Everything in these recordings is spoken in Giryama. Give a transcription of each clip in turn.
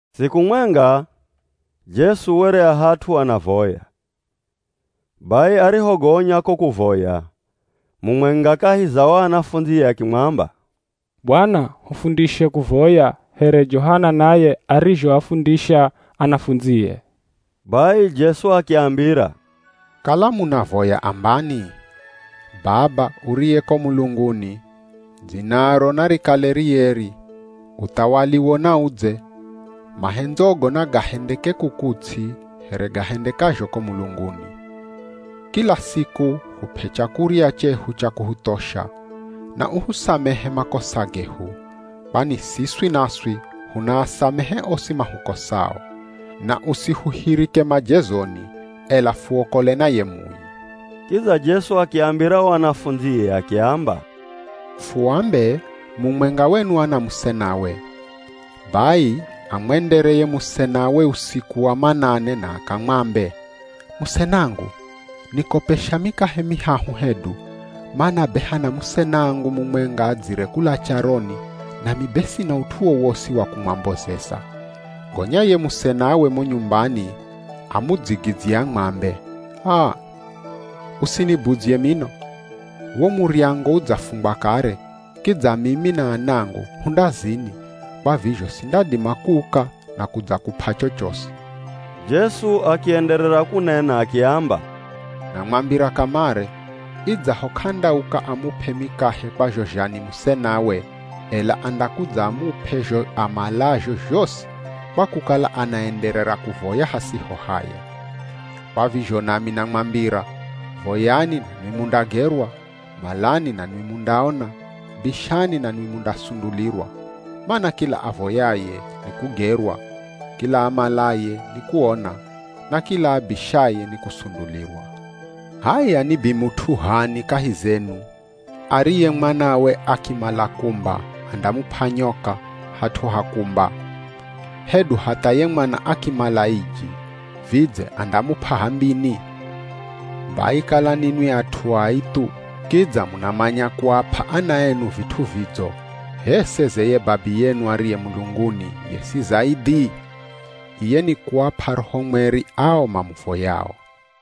Siku mwenga Jesu were a hat'u anavoya. Bai arihogonya ko kuvoya, mumwenga kahi za o anafundzie akimwamba, “Bwana, hufundishe kuvoya, here Johana naye arizhoafundisha anafundzie.” Bai Jesu akiambira, “Kala munavoya ambani, ‘Baba, [Uriye ko mulunguni], Dzinaro narikale rieri, Uthawaliwo naudze, [Mahendzogo nagahendeke kuku ts'i, here gahendekazho ko mulunguni.] Kila siku hup'e chakurya chehu cha kuhuthosha. Na uhusamehe makosa gehu, kwani siswi naswi hunaasamehe osi mahukosao. Na usihuhirike majezoni, [ela fuokole na ye Mui].’” Kidza Jesu akiambira o anafundzie akiamba, “Fuambe, mumwenga wenu ana musenawe, bai amwendere ye musenawe usiku wa manane na akamwambe, ‘Musenangu, nikopesha mikahe mihahu hedu, mana be hana musenangu mumwenga adzire kula charoni nami be sina ut'u wowosi wa kumwambozeza.’ “Gonya ye musenawe mo nyumbani amudzigidzye amwambe, ‘Aa! Usinibudzye mino, wo muryango udzafungwa kare, kidza mimi na anangu hu ndazini, kwa vizho sindadima kuuka na kudzakup'a chochosi.’” Jesu akienderera kunena akiamba, “Namwambira kamare, idzaho k'andauka amup'e mikahe kwa zho zha ni musenawe, ela andakudza amup'e zho amalazho zhosi kwa kukala anaenderera kuvoya hasiho haya. Kwa vizho nami namwambira, voyani nanwi mundagerwa, malani nanwi mundaona, bishani nanwi mundasundulirwa. Mana kila avoyaye, nikugerwa; kila amalaye, nikuona; na kila abishaye nikusundulirwa. H'aya ni bimut'u h'ani kahi zenu, ariye mwanawe akimala kumba andamup'a nyoka, hat'u ha kumba. Hedu hatha ye mwana akimala iji, vidze andamup'a h'ambini? Bai kala ninwi at'u ai thu, kidza munamanya kuap'a ana enu vit'u vidzo, h'e seze ye Babiyenu ariye mulunguni, ye si zaidhi? Iye nikuap'a Roho Mweri ao mamuvoyao!”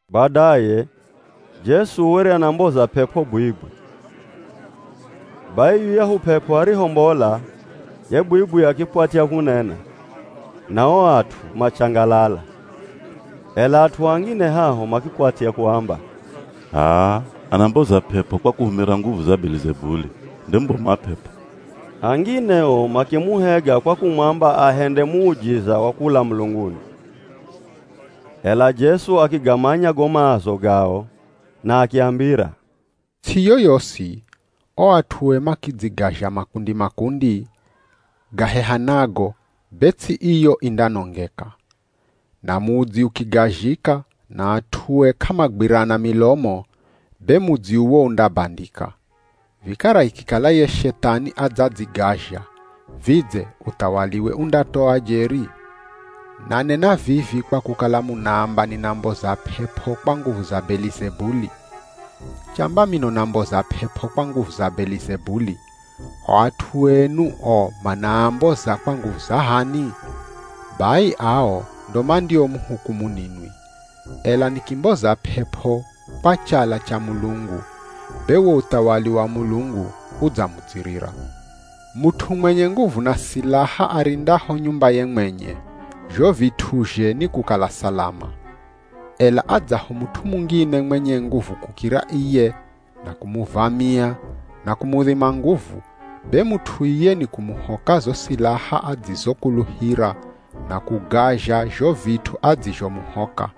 Badaye Jesu were anamboza p'ep'o bwibwi. Bai yuyahu p'ep'o arihombola, ye bwibwi akikwatya kunena, na o at'u machangalala. Ela at'u angine haho makikwatya kuamba, “H'aa, anamboza p'ep'o kwa kuhumira nguvu za Belizebuli, nde mubomu wa p'ep'o.” Angine o makimuhega kwa kumwamba ahende muujiza wa kula mulunguni. Ela Jesu akigamanya go maazo gao na akiambira, “Ts'i yoyosi, o at'ue makidzigazha makundi-makundi, gahehanago, be ts'i iyo indanongeka. Na mudzi ukigazhika na at'ue k'amagwirana milomo, be mudzi uwo undabandika. Vikara ikikala ye Shethani adzadzigazha, vidze uthawaliwe undatoa jeri? Nanena vivi kwa kukala munaamba ninamboza p'ep'o kwa nguvu za Belizebuli. Chamba mino namboza p'ep'o kwa nguvu za Belizebuli, o at'u enu o manaamboza kwa nguvu za h'ani? Bai ao ndo mandiomuhukumu ninwi. Ela nikimboza p'ep'o kwa chala cha Mulungu, be wo uthawali wa Mulungu udzamudzirira. “Mut'u mwenye nguvu na silaha, arindaho nyumbaye mwenye, zho vit'uzhe ni kukala salama. Ela adzaho mut'u mungine mwenye nguvu kukira iye na kumuvamia na kumudhima nguvu, be mut'u iye ni kumuhoka zo silaha adzizokuluhira na kugazha zho vit'u adzizhomuhoka.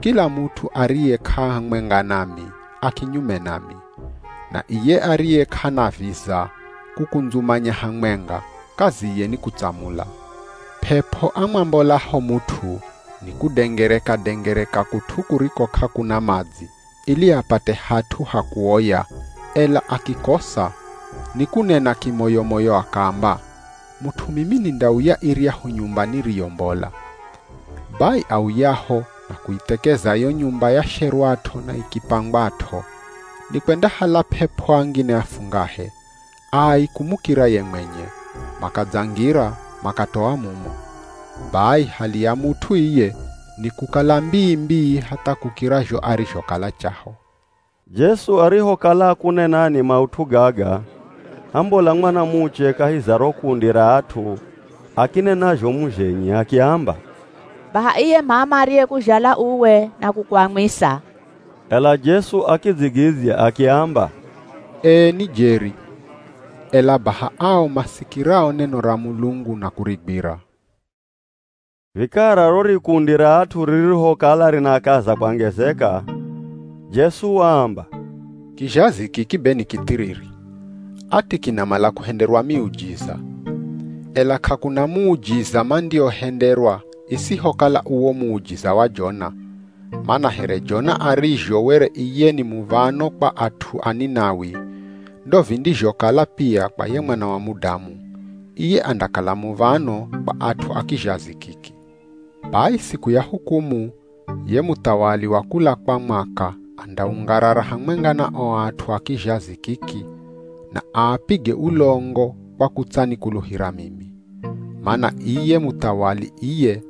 “Kila mut'u ariye k'ahamwenga nami, a kinyume nami. Na iye ariye k'anaviza kukundzumanya hamwenga, kaziye ni kutsamula.” “P'ep'o amwambolaho mut'u nikudengereka-dengereka kut'u kuriko k'akuna madzi ili apate hat'u ha kuoya, ela akikosa, nikunena kimoyo-moyo akaamba, ‘Mut'u mimi nindauya iryahu nyumba niriyombola.’ Bai auyaho na kuithekeza yo nyumba yasherwat'o na ikipangwat'o, nikwendahala p'ep'o angine afungahe, ai kumukira ye mwenye, makadzangira, makatoa mumo. Bai hali ya mut'u iye ni kukala mbii-mbii hatha kukira zho arizhokala chaho.” Jesu arihokala akunenani maut'u gaga hambola mwanamuche kahi za ro kundi ra at'u akinena zhomu zhenye akiamba, “Baha iye m'ama ariyekuzhala uwe na kukuamwisa.” Ela Jesu akidzigidzya akiamba, “Ee ni jeri, ela baha ao masikirao neno ra Mulungu na kurigwira.” Vikara ro rikundi ra at'u ririhokala rinakaza kwangezeka, Jesu waamba, “Kizhazi kiki be ni kithiriri! Ati kinamala kuhenderwa miujiza. Ela k'akuna muujiza mandiohenderwa isihokala uwo muujiza wa Jona. Mana here Jona arizho were iye ni muv̱ano kwa at'u a Ninawi, ndo vindizhokala pia kwa ye Mwana wa Mudamu. Iye andakala muv̱ano kwa at'u a kizhazi kiki. Bai siku ya hukumu, ye muthawali wa kula kwa mwaka andaungarara hamwenga na o at'u a kizhazi kiki na aapige ulongo kwa kutsanikuluhira mimi. Mana iye muthawali iye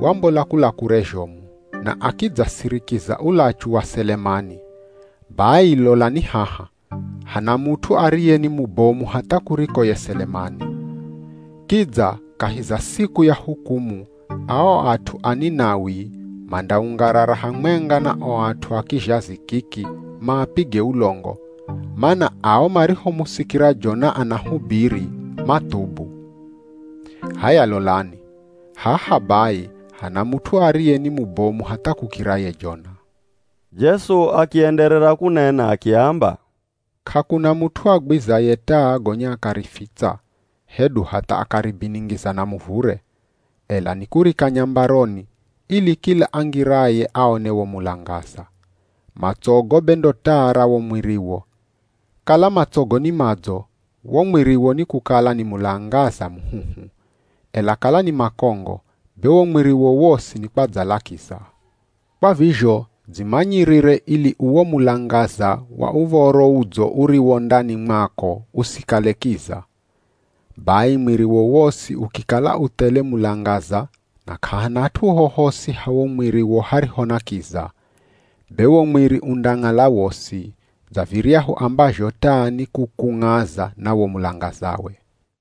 wambola kula kure zhomu, na akidzasirikiza ulachu wa Selemani. Bai lolani haha, hana mut'u ariye ni mubomu hatha kuriko ye Selemani. Kidza kahi za siku ya hukumu ao at'u a Ninawi mandaungarara hamwenga na o at'u a kizhazi kiki, maapige ulongo, mana ao marihomusikira Jona anahubiri mathubu. H'aya lolani, haha bai hana mut'u ariye ni mubomu hatha kukira ye Jona.” Jesu akienderera kunena akiamba, “K'akuna mut'u agwizaye taa gonya akarifitsa, hedu hatha akaribiningiza na muvure. Ela nikurika nyambaroni, ili kila angiraye aone wo mulangaza. Matsogo be ndo taa ra wo mwiriwo. Kala matsogo ni madzo, wo mwiriwo ni kukala ni mulangaza muhuhu, ela kala ni makongo, be wo mwiriwo wosi nikwadzala kiza. Kwa vizho dzimanyirire ili uwo mulangaza wa Uv̱oro Udzo uriwo ndani mwako usikale kiza. Bai mwiriwo wosi ukikala u thele mulangaza na k'ahana hat'u hohosi ha wo mwiri hariho na kiza, be wo mwiri undang'ala wosi, dza viryahu ambazho taa ni kukung'aza na wo mulangazawe.”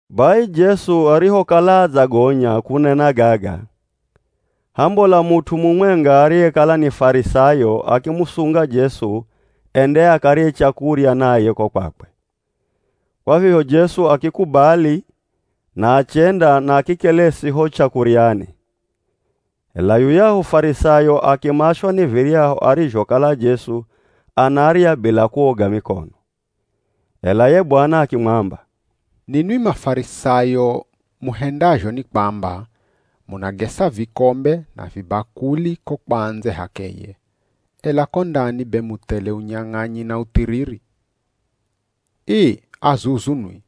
Bai Jesu arihokala adzagonya kunena gaga, hambola mut'u mumwenga ariyekala ni Farisayo akimusunga Jesu ende akarye chakurya naye ko kwakwe. Kwa vizho Jesu akikubali na achenda na akikelesi ho chakuryani. Ela yuyahu Farisayo akimashwa ni viryahu arizhokala Jesu anarya bila kuoga mikono. Ela ye Bwana akimwamba, “Ninwi Mafarisayo muhendazho ni kwamba munagesa vikombe na vibakuli ko kwa ndze h'akeye, ela ko ndani be mu thele unyang'anyi na uthiriri. Ii, azuzu nwi!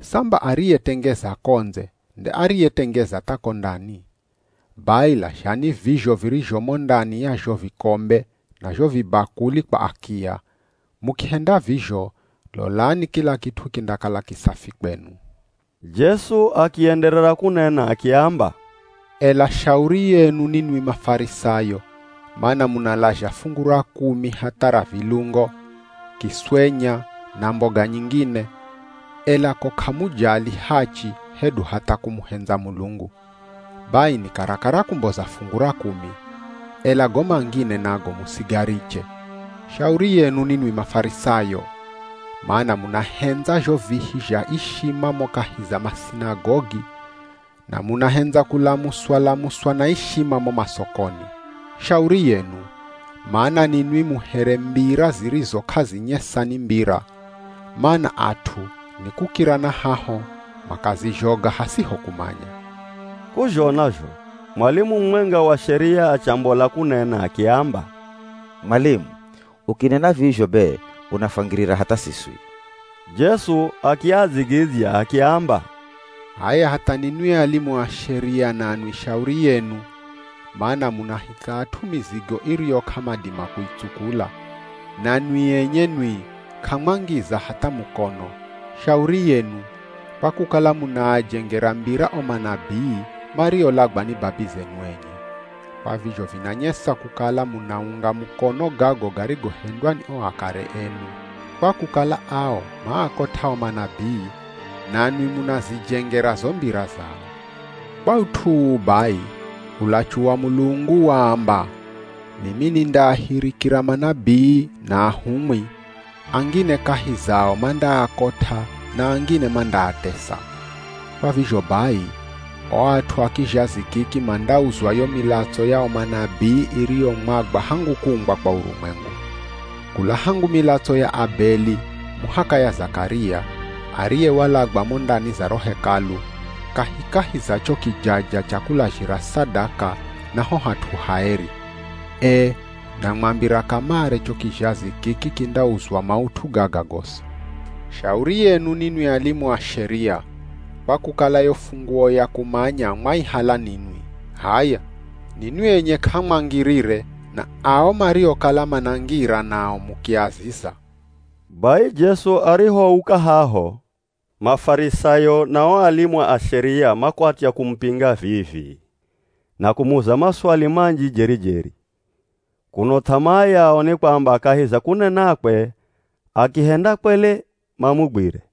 Samba ariyetengeza ko ndze nde ariyetengeza tha ko ndani. Bai lazhani vizho virizho mo ndani ya zho vikombe na zho vibakuli kwa akiya, mukihenda vizho, lolani kila kit'u kindakala kisafi kwenu.” Jesu akienderera kunena akiamba, “Ela shauri yenu ninwi Mafarisayo, mana munalazha fungu ra kumi hatha ra vilungo, kiswenya na mboga nyingine, ela ko k'amujali hachi hedu hatha kumuhendza Mulungu. Bai ni karakara kumboza fungu ra kumi, ela go mangine nago musigariche. Shauri yenu ninwi Mafarisayo! Mana munahendza zho vihi zha ishima mo kahi za masinagogi na munahendza kulamuswa-lamuswa na ishima mo masokoni. Shauri yenu! Mana ninwi mu here mbira zirizo k'azinyesa ni mbira, mana at'u ni kukira na haho makazizhoga hasiho kumanya.” K'uzhona zho mwalimu mumwenga wa Sheria achambola kunena akiamba, “Mwalimu, ukinena vizho be unafwangirira hatha siswi.” Jesu akiadzigidzya akiamba, “H'aya hatha ninwi alimu a Sheria nanwi shauri yenu, mana munahika at'u mizigo iriyo k'amadima kuitsukula, na nwi enye nwi k'amwangiza hatha mukono. Shauri yenu, kwa kukala munaajengera mbira o manabii, mariolagwa ni babizenu enye. Kwa vizho vinanyesa kukala munaunga mukono gago garigohendwa ni o akare enu, kwa kukala ao maakot'a o manabii, nanwi munazijengera zo mbira zao. Kwa ut'u uu bai ulachu wa Mulungu waamba, ‘Mimi nindaahirikira manabii na ahumwi, angine kahi zao mandaakot'a na angine mandaatesa.’ Kwa vizho bai, o at'u a kizhazi kiki mandauzwa yo milatso ya o manabii iriyomwagwa hangu kuumbwa kwa urumwengu. Kula hangu milatso ya Abeli muhaka ya Zakaria, ariye walagwa mo ndani za ro Hekalu, kahikahi za cho kijaja cha kulazhira sadaka na ho hat'u haeri. Ee, namwambira kamare cho kizhazi kiki kindauzwa maut'u gaga gosi. Shauri yenu ninwi alimu a Sheria, kwa kukala yo funguo ya kumanya mwaihala ninwi. H'aya, ninwi enye k'amwangirire na ao mariokala manangira nao mukiaziza.” Bai Jesu arihouka haho, Mafarisayo na o alimu a Sheria makwatya kumupinga vii-vii na kumuza maswali manji jeri-jeri, kuno th'amaa yao ni kwamba kahi za kunenakwe, akihenda kwele, mamugwire.